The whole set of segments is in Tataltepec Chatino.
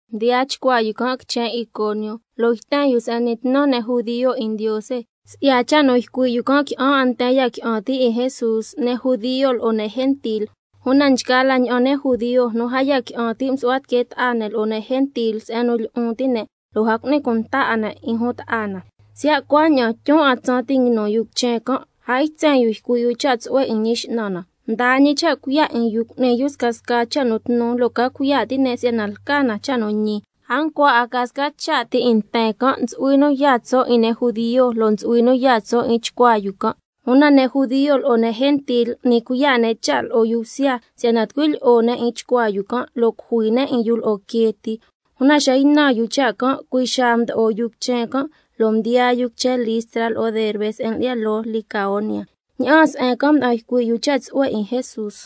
Mdiyaa chcuaa yu can' quichen Iconio, yten yu se'en n'ni tnu ne' judio 'in Ndiose, lo' si'ya cha' nu ycui' yu can', qui'an 'a nten ya qui'an ti' 'in Jesús, ne' judio, lo'o ne' gentil. Una nchgaa la ña'an ne' judio nu a ya qui'an ti', msu'hua tiquee ta'a ne' lo'o ne' gentil se'en nu lyi'un ti' ne' lo' a cu'ni cunta 'a ne' 'in jun ta'a na. Siya' cuaña'an, tyun 'a tsaan ti' nguinu yu quichen can', a ytsen yu ycui' yu cha' tsu'hue 'in Ñi X'nan na, mdaa ñi cha' cuiya' 'in yu cu'ni yu scasca cha' nu tnu, lo' ca cuiya' ti' ne' si'yana lca na cha' nu ñi. A ncua 'a ca sca cha' ti 'in nten can', ntsu'hui nu yaa tso' 'in ne' judio, lo' ntsu'hui nu yaa tso' 'in chcuaa yu can'. Una ne' judio lo'o ne' gentil m'ni cuiya' ne' cha' lo'o yu bsya, si'yana tucui lyi'o ne' 'in chcuaa yu can', lo' cujui ne' 'in yu lo'o quee ti. Una xa ynan yu cha' can', cui' xaa mdo'o yu quichen can', lo' mdiyaa yu quichen Listra lo'o Derbe, se'en lyi'ya loo Licaonia. Ña'aan se'en can' mda'an ycui' yu cha' tsu'hue 'in Jesús.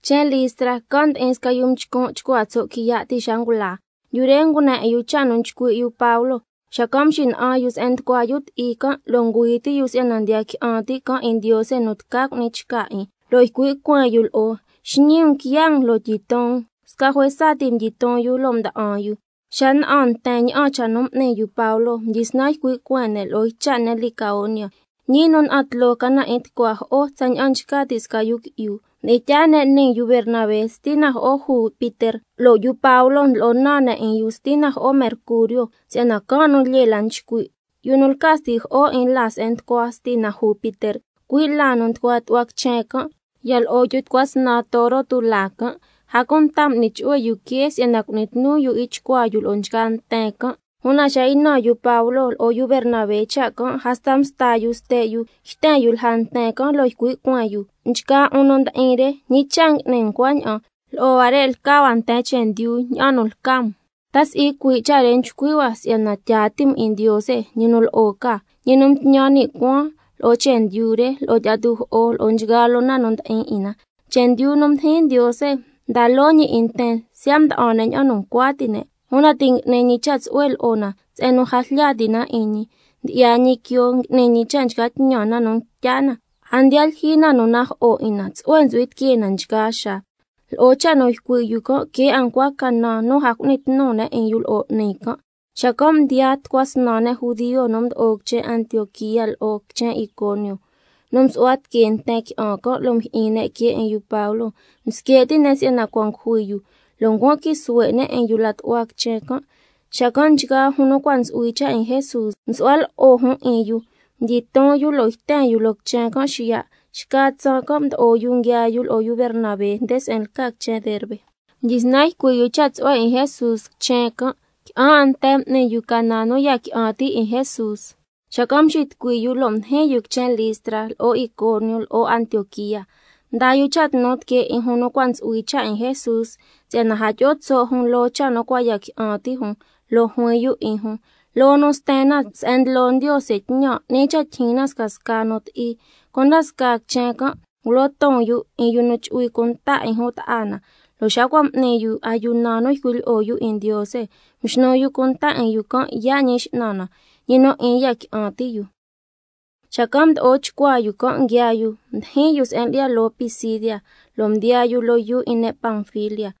Quichen Listra, can' ndi'in sca yu mchcun' chcua tso' quiya' ti' xa ngula. Yu re ngune 'in yu cha' nu nchcui' yu Pablo, xacan' mxina'an yu se'en nducua yu ti'i can', lo' ngüi ti' yu si'yana ndiya qui'an ti' can' 'in Ndiose nu tca cu'ni chca 'in, lo' ycui' cueen yu lo'o: Xñii um quiya' um, lo' tyiton um. Sca juesa ti mdyiton yu lo' mda'an yu. Xa na'an nten ña'an cha' nu m'ni yu Pablo, xacan' mdyisnan ycui' cueen ne' lo'o ycha' ne' Licaonia: Ñii nu na'an tloo ca na 'in tucua jo'o tsaña'an nchca ti' sca yu qui'yu. Mdi'in tyaa ne' nii yu Bernabé, Stina Jo'o Jupiter, lo' yu Pablo ndlo'o naan ne' 'in yu, Stina Jo'o Mercurio, si'yana can' nu lyee la nchcui'. Yu nu lca stijo'o 'in laa se'en nducua Stina Jupiter, cui' laa nu nducua tu'hua quichen can', ya lo'o yu tucua snan toro tulaa can', a cunta m'ni chu'hue yu quee se'en nu cu'ni tnu yu 'in chcuaa yu lo'o nchgaa nten can'. Una xa ynan yu Pablo lo'o yu Bernabé cha' can', hasta msta yu ste' yu yten yu lja nten can', lo' ycui' cueen yu: Nchgaa 'un nu ndi'in re, ¿ñi cha' ngui'ni um cuaña'an? Lo'o huare' lca hua nten chendyu ña'an nu lca um, ta si'i cui' cha' re nchcui' hua si'yana tyaa ti' um 'in Ndiose, ñi nu lo'o ca, —ñi nu mtñan ni' cuaan lo'o chendyu re, lo'o tyi'a tujo'o, lo'o nchgaa loo na nu ndi'in 'in na—. Chendyu nu mdijin Ndiose mda loo ñi 'in nten, siya' mda'an ne' ña'an nu ncua ti' ne'. Una ti' ngui'ni ñi cha' tsu'hue lo'o na se'en nu a jlya ti' na 'in ñi: Ndyi'ya ñi quioo, ngui'ni ñi cha' nchca tñan na nu ntya na, a ndiya lyijyi na nu najo'o 'in na, tsu'hue ntsu'hui tiquee na nchgaa xaa. Lo'o cha' nu ycui' yu can', que' 'a ncua canan nu a cu'ni tnu ne' 'in yu lo'o 'ni can'. Xacan' mdiyaan tucua snan ne' judio nu mdo'o quichen Antioquía lo'o quichen Iconio, nu msu'hua tiquee nten qui'an can', lo' yato'o mjyi'in ne' quee 'in yu Pablo, msque' ti' ne' si'yana cua' ngujui yu, lo' ncuan quii suhue' ne' 'in yu la tu'hua quichen. Nchgaa jun nu cua' ntsu'hui cha' 'in Jesús msu'hua lo'o jun 'in yu, mdyiton yu lo' yten yu loo quichen can' xiya'. Xca tsaan can' mdo'o yu nguiaa yu lo'o yu Bernabé nde se'en lca quichen Derbe. Mdyisnan ycui' yu cha' tsu'hue 'in Jesús quichen can', qui'an 'a nten m'ni yu canan nu ya qui'an ti' 'in Jesús, xacan' mxitucui yu, lo' mdijin yu quichen Listra, lo'o Iconio, lo'o Antioquía. Mdaa yu cha' tnu tiquee 'in jun nu cua' ntsu'hui cha' 'in Jesús, si'yana a tyi'o tso' jun loo cha' nu cua' ya qui'an ti' jun, lo' juin yu 'in jun: Loo nu sten na se'en ndlo Ndiose tñan, 'ni cha' tyijyin na scasca nu ti'i. Cunda scaa quichen can', ngulo ton yu 'in yu nu chu'hui cunta 'in jun ta'a na, lo' xa cua' m'ni yu ayuna nu ycui' lyi'o yu 'in Ndiose, mxnu yu cunta 'in yu can' yaa' Ñi X'nan na, ñi nu 'in ya qui'an ti' yu. Xacan' mdo'o chcuaa yu can' nguiaa yu, mdijin yu se'en lyi'ya loo Pisidia, lo' mdiyaa yu loo yuu 'in ne' Panfilia.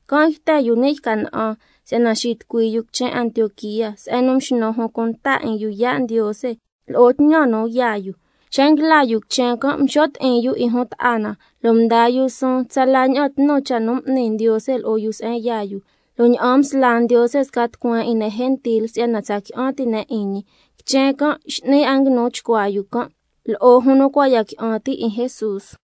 Can' yten yu ni' yca na'an, si'yana xitucui yu quichen Antioquía, se'en nu mxnu jun cunta 'in yu yaa' Ndiose lo'o tñan nu yaa yu. Xa nguila yu quichen can', mxo' ti'in yu 'in jun ta'a na, lo' mdaa yu suun tsala ña'an tnu cha' nu m'ni Ndiose lo'o yu se'en yaa yu, lo' ña'an msla Ndiose sca tucueen 'in ne' gentil si'yana tsa qui'an ti' ne' 'in ñi. Quichen can' x'ni 'a nguinu chcuaa yu can' lo'o jun nu cua' ya qui'an ti' 'in Jesús.